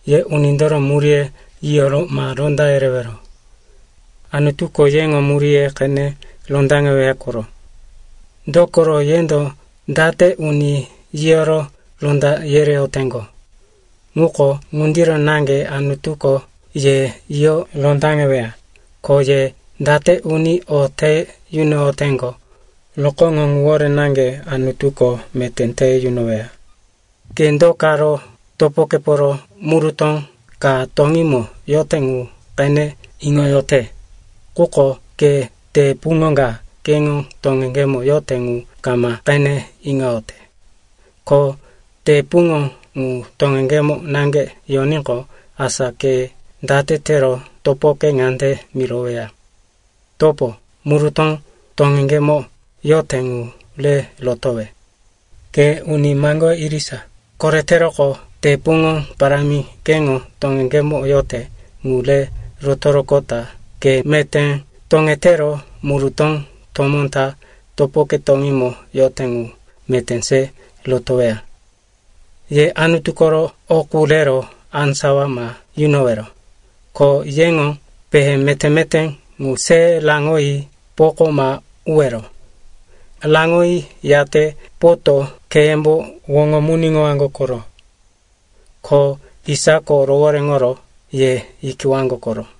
“Ye unindoro muríye yiyoro ma ronda yerewero. Anutuko yeŋo muríye qene rondaŋeweya koro. Dokoro yendo date uni yiyoro ronda yereyoteŋgo, ŋuko ŋundiro naŋge Anutuko ye yiyo rondaŋeweya. Ko ye date uni o te yunoyoteŋgo rokóŋo ŋuwore naŋge Anutuko meté te yunoweya. “Ke do karo topokeporo murutó ka toŋímo yote ŋu qene iŋoyote, quko ke te puŋo ka keŋo toŋeŋgemo yote ŋu kama qene iŋoyote? Ko te puŋo ŋu toŋeŋgemo naŋge yoníqo, asa ke date tero topoke ŋande miroweya, ‘Topo, murutó toŋeŋgemo yote ŋu re rotowe?’ Ke uni maŋgoye irisa, koreteroqo te puŋo parámi keŋo toŋeŋgemo yote ŋu re rotoroqota ke meté toŋetero murutó tomó ta topoke toŋímo yote ŋu meté se rotoweya. “Ye Anutu koro o qu rero á sawa ma yunowero. Ko yeŋo pehe meté-meté ŋu se raŋoyi poko ma uwero. Raŋoyi, yate poto kheyembo woŋomuniŋowaŋgo koro, ko isako rohoréŋoro ye yikiwaŋgo koro.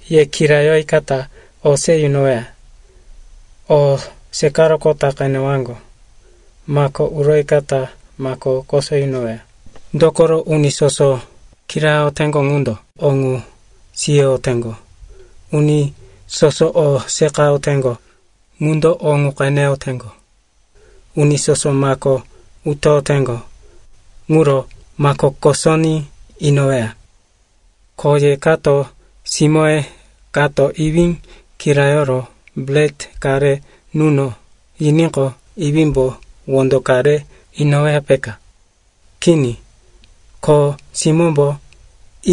“Ye kirayoyikata o se yunoweya; o seqaroqota qenewaŋgo; mako uroyikata mako koso yunoweya. Dokoro uni soso kirayoteŋgo ŋundo o ŋu siyoyoteŋgo; uni soso o seqayoteŋgo ŋundo o ŋu qeneyoteŋgo; uni soso mako utoyoteŋgo, ŋuro mako kosoní inoweya. “Ko ye kato simóye kato iwí kirayoro bret ka re nuno yiníqo, iwímbo wondo ka re inoweya, peka? Kini. Ko simómbo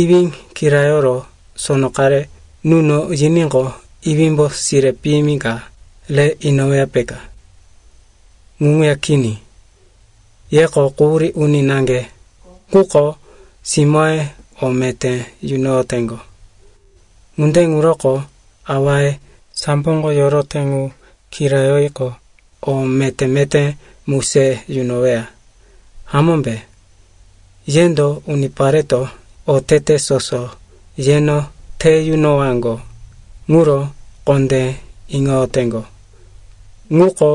iwí kirayoro sono qare nuno yiníqo, iwímbo sire piyimi ka re inoweya, peka? Ŋu ŋuya kini. Yeko quhurí uni naŋge quko simóye o meté yunoyoteŋgo. Ŋunde ŋuroko awaye samboko yorote ŋu kirayoyiqo, o meté-meté mu se yunoweya, hamómbe? Yendo unipareto otete soso yeno te yunowaŋgo ŋuro kondé iŋoyoteŋgo ŋuko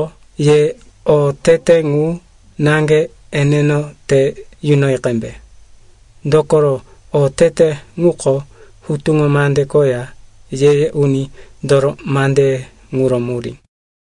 ye otete ŋu naŋge eneno te yunoyi qembe. Dokoro otete ŋuko Hutuŋo Mande koya Ye-ye Unindoro mandeye ŋuro murí.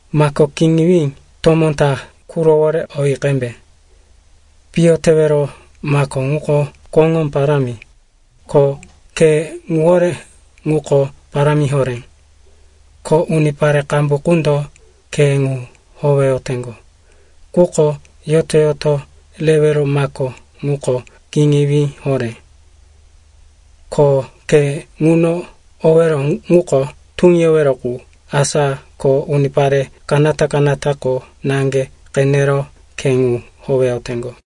“Mako kiŋiwí tomó ta qurowore oyi qembe. Piyo tewero mako ŋuko koŋó parámi, ko khe ŋuwore ŋuko parámi horé. Ko unipare qambu qundo khe ŋu howeyoteŋgo. Quko yoto-yoto rewero mako ŋuko kiŋiwí horé, ko khe ŋuno owero ŋuko tuŋiyowero qu. Asa ko unipare kanata-kanatako naŋge qenero khe ŋu howeyoteŋgo.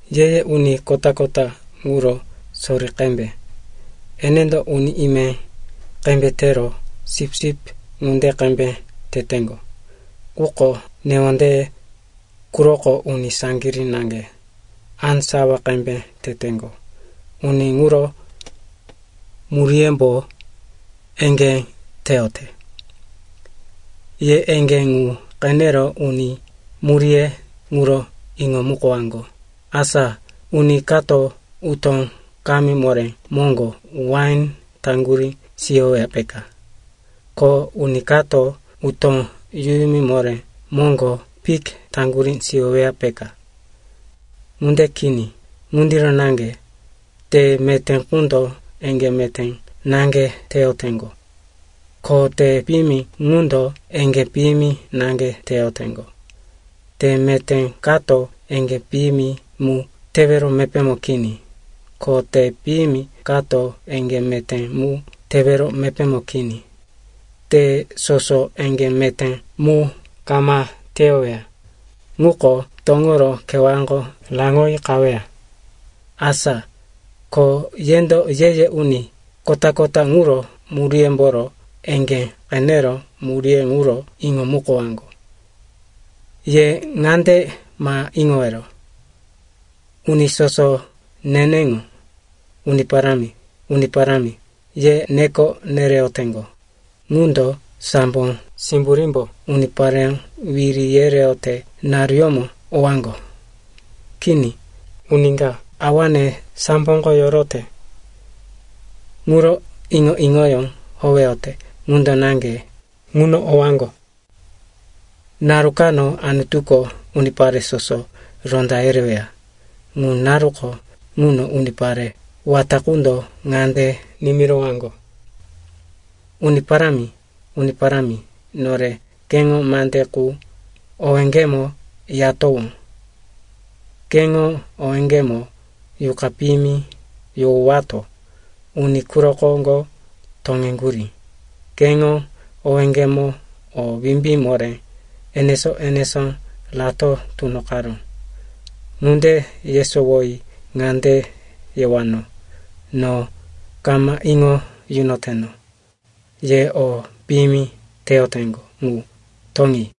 “Ye-ye uni kota-kota ŋuro sori qembe. Enendo uni ime qembe tero, sipsip ŋunde qembe teteŋgo. Quko newondeye quroko uni saŋgirí naŋge, á sawa qembe teteŋgo. Uni ŋuro muríyembo eŋgé teyote. Ye eŋgé ŋu qenero uni muríye ŋuro iŋomukowaŋgo. Asa uni kato utó kamí moré moŋgo wain taŋgurí siyoweya, peka? Ko uni kato utó yuyumi moré moŋgo fik taŋgurí siyoweya, peka? Ŋunde kini. Ŋundiro naŋge te meté ŋundo eŋgé meté naŋge teyoteŋgo. Ko te piyimi ŋundo eŋgé piyimi naŋge teyoteŋgo. Te meté kato eŋgé piyimi mu tewero mepémo kini. Ko te piyimi kato eŋgé meté mu tewero mepémo kini. Te soso eŋgé meté mu kama teyoweya ŋuko, toŋoro kewáko raŋoyi qaweya. Asa ko yendo ye-ye uni kota-kota ŋuro muríyemboro eŋgé qenero muríye ŋuro iŋomukowaŋgo. “Ye ŋande ma iŋowero, uni soso neneŋo, ‘Uni Parámi, Uni Parámi,’ ye neko nereyoteŋgo ŋundo sambo simburímbo unipareyó wiri yereyote naruyómo owaŋgo. Kini. Uni ka awane samboko yorote ŋuro iŋo-iŋoyó howeyote ŋundo naŋge ŋuno owaŋgo. Naru kano Anutuko unipare soso ronda yereweya. Ŋu naruko ŋuno unipare wata qundo ŋande nimirowaŋgo, ‘Uni Parámi, Uni Parámi, nore keŋo mande qu owéŋgemo yatowó. Keŋo owéŋgemo yuqa piyimi yohowato uni quro koŋgo toŋeŋgurí. Keŋo owéŋgemo o wimbí moré enesó-enesó rato tunoqaró.’ Ŋunde yesowoyi ŋande yewano, ‘No kama iŋo yunoteno. Ye o piyimi teyoteŋgo ŋu, toŋi.’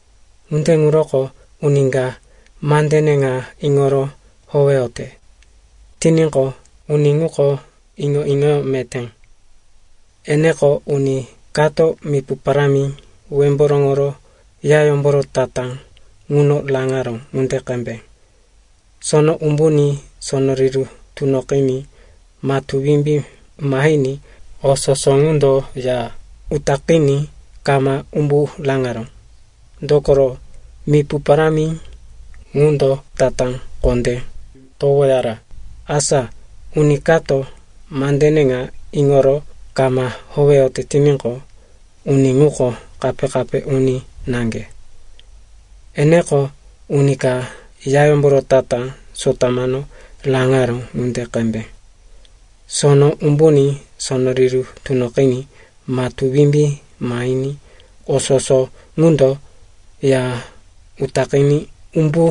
“Ŋunde ŋuroko uni ka mandene ŋa iŋoro howeyote tiníqo, uni ŋuko iŋo-iŋoyó meté. Eneko uni kato mipu parámi wemboroŋoro yayómboro tatá ŋuno raŋaró ŋunde qembe. Sono umbuní, sono riru tunoqiní, matú wimbí mahiní, o soso ŋundo ya utaqiní kama umbu raŋaró. Dokoro, mipu parámi ŋundo tatá kondé towoyara. Asa uni kato mandene ŋa iŋoro kama howeyote tiníqo, uni ŋuko kape-kape uni naŋge. Eneko uni ka yayómboro tatá sotamano raŋaró ŋunde qembe. Sono umbuní, sono riru tunoqiní, matú wimbí mahiní, o soso ŋundo ya utaqiní umbu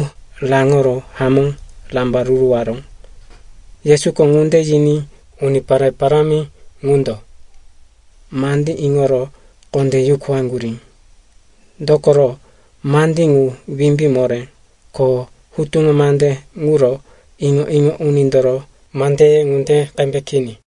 raŋoro hamó rambaruruwaró.” Yesuko ŋunde yiní unipare parámi ŋundo mandí iŋoro kondé yukuwaŋgurí. Dokoro, mandí ŋu wimbí moré, ko hutuŋo mande ŋuro iŋo-iŋo unindoro mandeye ŋunde qembe kini.